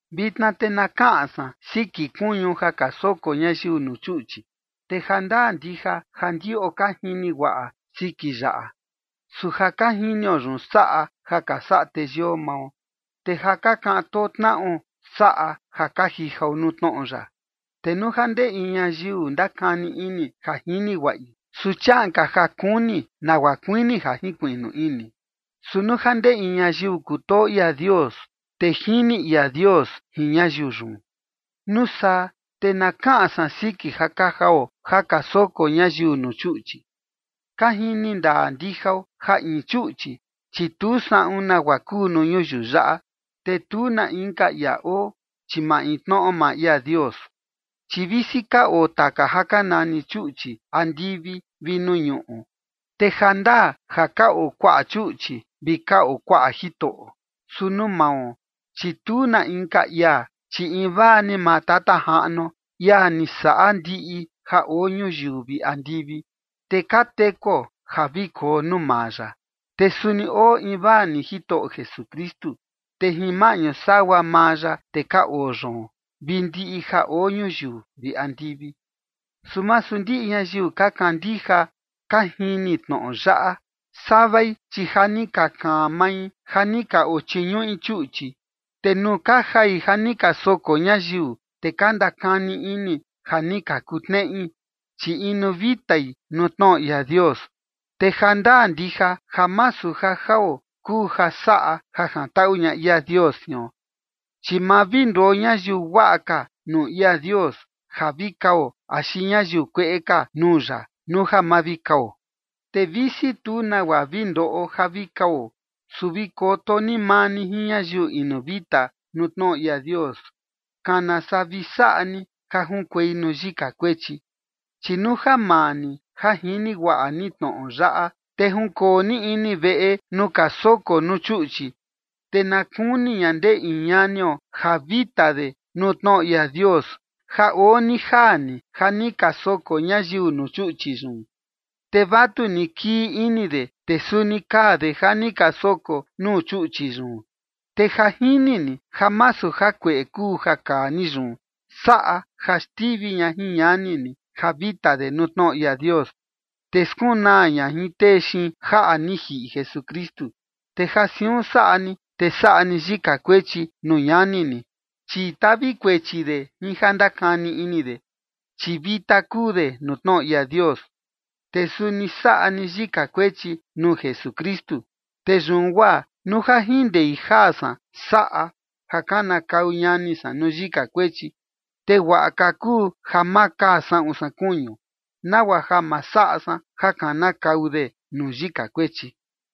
Vitna te na kaꞌan san siki kuñu ja ka soko ñayiu nuu chuꞌchi. Te ja ndaa ndija ja ndiꞌo ka jini guaꞌa siki yaꞌa. Su ja ka jinio yun saꞌa ja ka saꞌa teyio mao, te ja ka kaꞌan too tnaꞌo saꞌa ja ka jijao nuu tnoꞌo ya. Te nuu ja ndee in ñayiu ndakani ini ja jini guaꞌi, su chiaꞌan ka ja kuni nagua kuini ja jinkuiꞌnu ini. Su nuu ja ndee in ñayiu kutoo ia Dios, te jini ia Dios jin ñayiu yun. Nuu saa, te na kaꞌan san siki ja ka jao ja ka soko ñayiu nuu chuꞌchi. Ka jini ndaa ndijao ja in chuꞌchi, chi tu saꞌun nagua kuu nuu ñuyiu yaꞌa, te tu na inka ia oo, chi maintnoꞌo maa ia Dios. Chi visi ka oo taka ja ka nani chuꞌchi andivi vi nuu ñuꞌu, te ja ndaa ja ka oo kuaꞌa chuꞌchi vi ka oo kuaꞌa jitoꞌo. Su nuu mao, chi tu na inka ia, chi invaa ni maa Tata Jaꞌnuo, ia ni saꞌa ndiꞌi ja oo ñuyiu vi andivi, te ka tekuo ja vi koo nuu maa ya. Te suni oo invaa ni Jitoꞌo Jesukristu, te jin maꞌñu sagua maa ya, te ka oo yoon, vi ndiꞌi ja oo ñuyiu vi andivi. Su masu ndiꞌi ñayiu ka kandija ka jini tnoꞌo yaꞌa. Savai, chi ja ni ka kaan mai ja ni ka ochiñuꞌi chuꞌchi, te nuu ka jai ja ni ka soko ñayiu, te ka ndakani ini ja ni ka kutneꞌi, chi inu vitai nuu tnoꞌo ia Dios. Te ja ndaa ndija ja masu ja jao kuu ja saꞌa ja jantaꞌu ña ia Dios jion. Chi ma vi nduo ñayiu guaꞌa ka nuu ia Dios ja vi kao axi ñayiu kueꞌe ka nuu ya nuu ja ma vi kao. Te visi tu nagua vi ndoꞌo ja vi kao, su vi koto ni maa ni jin ñayiu inu vita nuu tnoꞌo ia Dios, kana saa vi saꞌa ni ja junkuei nuu yika kuechi. Chi nuu ja maa ni ja jini guaꞌa ni tnoꞌo yaꞌa, te junkoo ni ini veꞌe nuu ka soko nuu chuꞌchi, te na kuni ña ndee in ñanio ja vita de nuu tnoꞌo ia Dios, ja oo ni jaa ni ja ni ka soko ñayiu nuu chuꞌchi yun, te vatuni kii ini de, te suni kaa de ja ni ka soko nuu chuꞌchi yun. Te ja jini ni ja masu jakueꞌe kuu ja kaa ni yun, saꞌa ja xtivi ña jin ñani ni ja vita de nuu tnoꞌo ia Dios, te skunaa ña jin tee xiin jaꞌa ni jiꞌi Jesukristu. Te ja siun saꞌa ni, te saꞌa ni yika kuechi nuu ñani ni, chi tavi kuechi de jin ja ndakani ini de, chi vita kuu de nuu tnoꞌo ia Dios. Te suni saꞌa ni yika kuechi nuu Jesukristu. Te yun guaa nuu ja jin ndei jaa san saꞌa ja kanakau ñani san nuu yika kuechi, te guaꞌa ka kuu ja ma kaa saꞌun san kuñu, nagua ja ma saꞌa san ja kanakau de nuu yika kuechi.